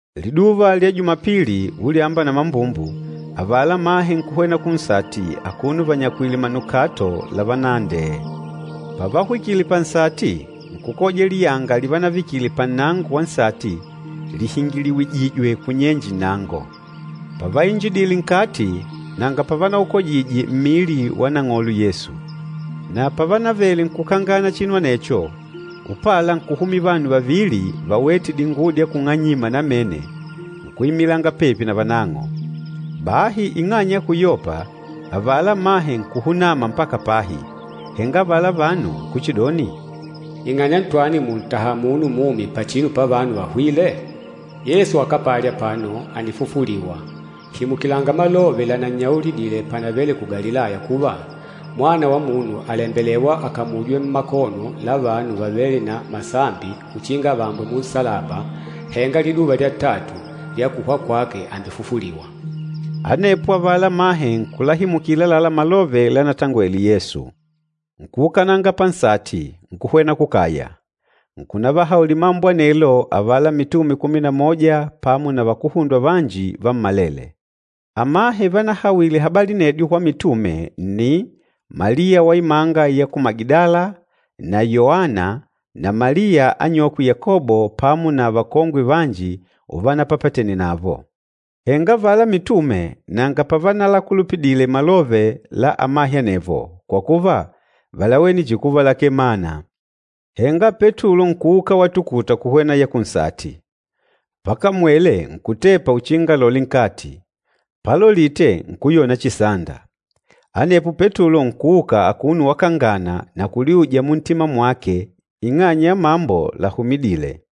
Liduva lya Jumapili, ulyamba na mambumbu, avala amahe nkuhwena kunsati akuno vanyakwìlè manukato lavanaandee. Pavahwikile pansati, nkukoja liyanga livanavikile pannango wa nsati lihingiliwijijwe kunyenje nnango. Pavainjidile nkati nanga pavanaukojije mmili wa Nang'olo Yesu. Na pavanavele nkukangana chinu anecho, upala nkuhumila vanu vavili vawête dinguwo dya kung'anyima namene nkuimilanga pepi na vanang'o. Bahi ing'anya ya kuyopa, avala amahe nkuhunama mpaka pahi. Henga avala vanu nkuchidoni, “Ing'anya ntwani mùntaha munu mumi pachinu pavanu vahwîle? Yesu akapali apano, ànifufuliwa. Himukilanga malove lanannyaulidile panavele ku Galilaya kuva, ‘Mwana wa Munu àlembelewa akamujwe mmakono la vanu vavêle na masambi uchinga avambwe munsalaba, henga liduva lya tatu lya kuhwa kwake àmbefufuliwa.’” Anepo avala amahe nkulahimukila àlalá malove lanatangwele Yesu. Nkuukananga pansati, nkuhwena kukaya, nkunavahaulila mambo anelo avala mitume kumi na moja pamo na vakuhundwa vanji vammalele. Amahe vanahawile habali anedyo kwa mitume nni, Maliya wa imanga ya ku Magidala na Yoana na Maliya anyokwe Yakobo pamo na vakongwe vanji uvanapapatene navo. Henga avala mitume nanga pavanalakulupidile malove la amahe anevo, kwa kuva, válawene chihi kuva lakee mana. Henga Petulo nkuuka watukuta kuhwena ya kunsati. Pakamwele nkutepa uchinga alole nkati, palolite nkuyona chihi sanda. Anepo Petulo nkuuka akuno wakangana na kuliuja muntima mwake ing'anya ya mambo lahumidîle.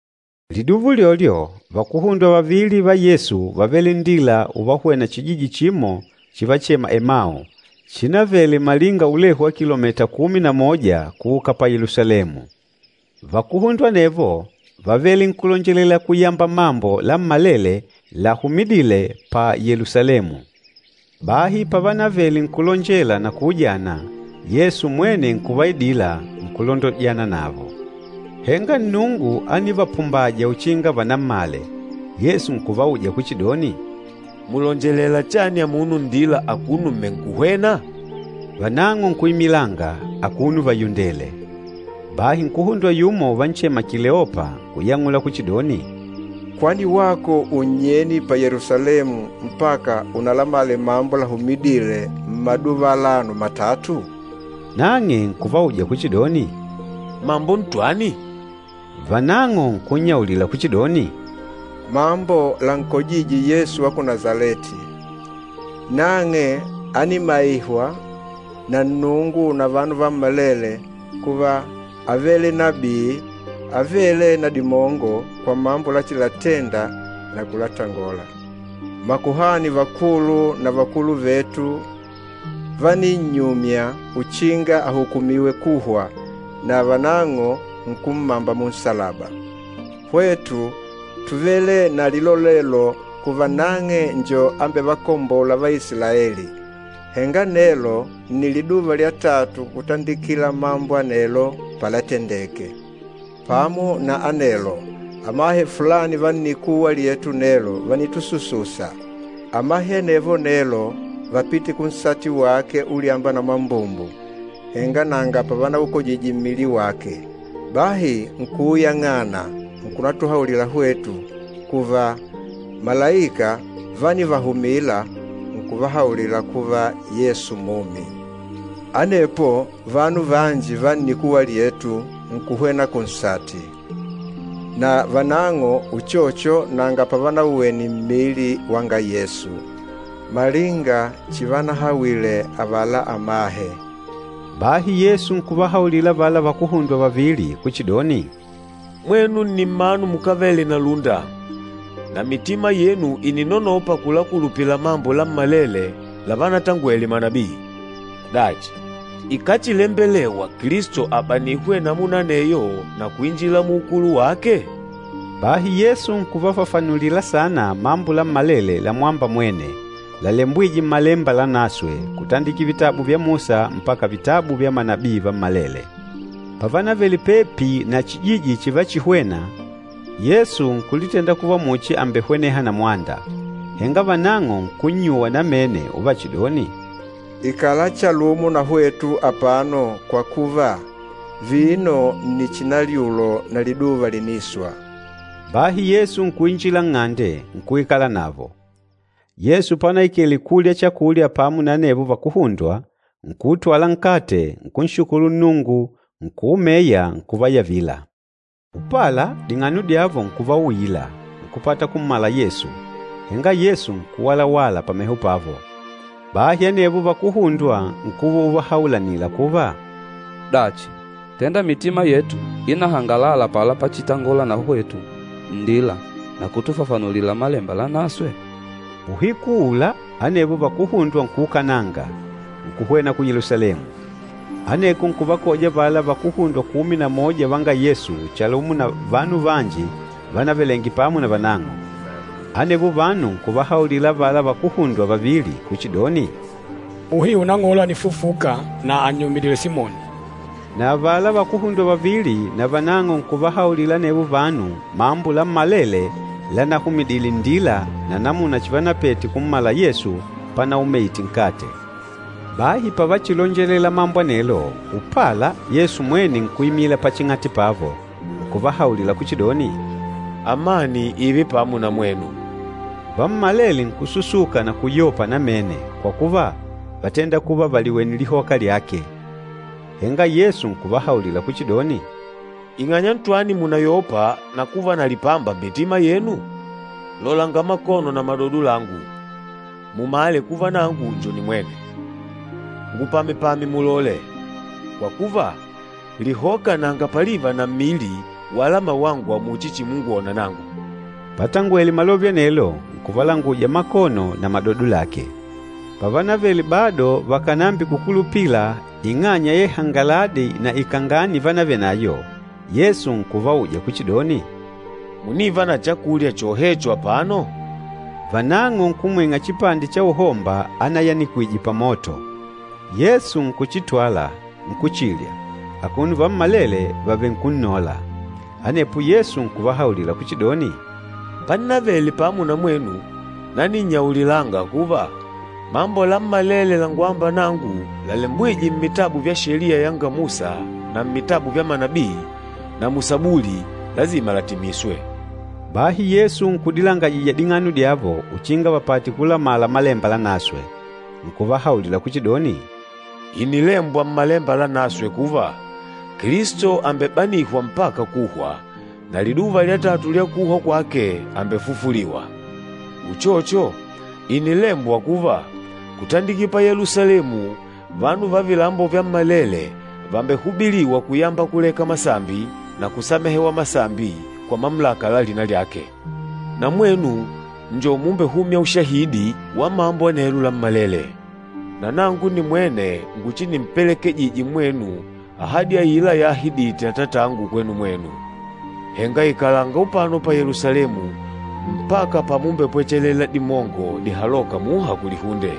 Liduva ulyolyo, vakuhundwa vavili va Yesu vávele nndila uvahwena chijiji chimo chivachema Emau, chinavele malinga ulehu wa kilomita kumi na moja kuuka pa Yelusalemu. Vakuhundwa anevo vávele nkulonjela kuyamba mambo lammalele lahumidîle pa Yelusalemu. Bahi pavanavele nkulonjela na kuujana, Yesu mwene nkuvaidila, nkulondojana navo. Henga Nnungu ánivapumbaja uchinga vanammale. Yesu nkuvauja kuchidoni, “Mùlonjelela chani amuno nndila akuno mmenkuhwènà?” Vanang'o nkuimilanga, akuno vayundèlè. Bahi nkuhundwa yumo, uvanchema Kileopa nkuyang'ula kuchidoni, “Kwani wako unnyeni pa Yelusalemu mpaka unalamale mambo lahumidîle mmaduva alano matatu?” Nang'e nkuvauja kuchidoni, “Mambo ntwani?” Vanang'o nkunnyaulila kuchidoni, “Mambo lankojîje Yesu wa ku Nasaleti. Nang'e ánimaihwa na Nnungu na vanu vammalele kuva ávele nabii avêle na dimongo kwa mambo lachilatenda na kulatangola. Makuhani vakulu na vakulu vetu váninnyumya uchinga ahukumiwe kuhwa, na vanang'o nkummamba munsalaba. Hwetu túvele na lilolelo kuva nang'e njo ambevakombôla Vaisilaeli. Henga nelo nni liduva lya tatu kutandikila mambo anelo palatendeke. Pamo na anelo, amahe fulani va nnikuwa lyetu nelo vànitusususa. Amahe anevo nelo vápite kunsati wake ulyamba na mambumbu, henga nanga pavanaukojije mmili wake. Bahi nkuuyang'ana nkunatuhaulila hwetu kuva, malaika vánivahumila nkuvahaulila kuva, Yesu mumi. Anepo vanu vanji va nnikuwa lyetu nkuhwena kunsati. Na vanang'o uchocho nanga pavanauwene mmili wanga Yesu, malinga chivanahawile avala amahe.” Bahi Yesu nkuvahaulila avala vakuhundwa vavili kuchidoni, “Mwenu ni mmanu mukávele na lúnda na mitima yenu ìninonopa kulakulupila mambo lammalele lavanatangwele manabii! Dachi, ikáchilembelewa Kilisto abanihwe namuna aneyo na kuinjila muukulu wake?” Bahi Yesu nkuvafafanulila saana mambo lammalele lamwâmba mwene, lalembwîje Mmalemba Lanaswe, kutandikila vitabu vya Musa mpaka vitabu vya manabii vammalele. Pavanavele pepi na chijiji chivachihwena, Yesu nkulitenda kuva muchi àmbehweneha na mwanda. Henga vanang'o nkunnyuwa namene uvachidoni, “Ikala chalumo na hwetu apano kwa kuva, vino nni chinalyulo na liduva lìniswa.” Bahi Yesu nkuinjila nng'ande, nkuikala navo. Yesu panaikele kulya chakulya pamo na anevo vakuhundwa, nkuutwala nkate, nkunshukulu Nnungu, nkuumeya, nkuvayavila. Upala, ding'ano dyavo nkuvauila, nkupata kummala Yesu, henga Yesu nkuwalawala pameho pavo. Bahi anevo vakuhundwa nkuva uvahaulanila kuva, “Dachi, tenda mitima yetu ínahangalala apala pachitangola na hwetu nndila na kutufafanulila Malemba Lanaswe?” Uhiku uula anevo vakuhundwa nkuukananga, nkuhwena ku Yelusalemu. Aneko nkuvakoja avala vakuhundwa kumi na moja vanga Yesu chalumo na vanu vanji vanavelenge pamo na vanang'o. Anevo vanu nkuvahaulila avala vakuhundwa vavili kuchidoni, “Muhiu Nang'olo ànifufuka, na ànnyumidile Simoni.” Na avala vakuhundwa vavili navanang'o nkuvahaulila anevo vanu mambo lammalele lanahumidile nndila na namuna chivanapete kummala Yesu panaumeite nkate. Bahi pavachilonjelela mambo anelo, upala Yesu mwene nkuimila paching'ati pavo, nkuvahaulila kuchidoni, “Amani ììve pamo na mwenu.” Vammalele nkususuka na kuyopa namene kwa kuva, vátenda kuva vàliwene lihoka lyake. Henga Yesu nkuvahaulila kuchidoni, “Ing'anya ntwani mùnayopa na kuva na lipamba mmitima yenu? Lolanga makono na madodo langu, mumale kuva nangu njo nimwene. Ngupamepame mulole, kwa kuva, lihoka nanga paliva na mmili wala mawangwa muchi chimungwona nangu.” Patangwele malove anelo, nkuvalanguja makono na madodo lake. Pavanavele bado vakànambikukulupila ing'anya ya ihangaladi na ikangani ivanavenayo, Yesu nkuvauja kuchidoni, “Mùniva na chakulya chohecho apano?” Vanang'o nkumwing'a chipande cha uhomba anayanikwije pamoto. Yesu nkuchitwala, nkuchilya, akuno vammalele vavenkunnòlà. Anepo Yesu nkuvahaulila kuchidoni, “Pannavele pamo na mwenu naninnyaulilanga kuva, mambo lammalele langwâmba nangu lalembwîje mmitabu vya Sheliya yanga Musa na mmitabu vya manabii na mu Sabuli, lasima latimiswe.” Bahi Yesu nkudilangajija ding'ano dyavo uchinga vapate kulamala Malemba Lanaswe. Nkuvahaulila kuchidoni, “Ìnilembwa Mmalemba Lanaswe kuva, Kilisto àmbebanihwa mpaka kuhwa, na liduva lya tatu lya kuhwa kwake àmbefufuliwa. Uchocho, ìnilembwa kuva, kutandikila pa Yelusalemu, vanu va vilambo vyammalele vàmbehubiliwa kuyamba kuleka masambi na kusamehewa masambi kwa mamulaka la lina lyake. Na mwenu njo mumbehûmya ushahidi wa mambo anelo lammalele. Na nangu nimwene nguchinimpelekejije mwenu ahadi aila yaahidite Atatangu kwenu mwenu. Henga ikalanga upano pa Yelusalemu mpaka pamumbepwechelela dimongo dihalôka muha kulihunde.”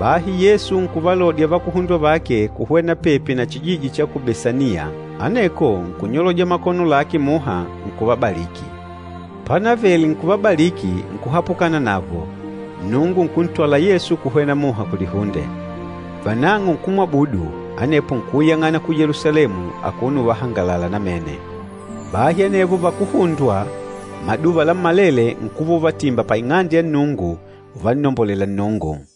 Bahi Yesu nkuvalodya vakuhundwa vake kuhwena pepi na chijiji cha ku Besaniya, aneko nkunyoloja makono lake muha, nkuvabaliki. Panavele nkuvabaliki nkuhapukana navo, Nnungu nkuntwala Yesu kuhwena muha kulihunde. Vanang'o nkumwabudu, anepo nkuuyang'ana ku Yelusalemu akuno uvahangalala namene. Bahi anevo vakuhundwa maduva lammalele nkuva uvatimba pa Ing'ande ya Nnungu uvannombolela Nnungu.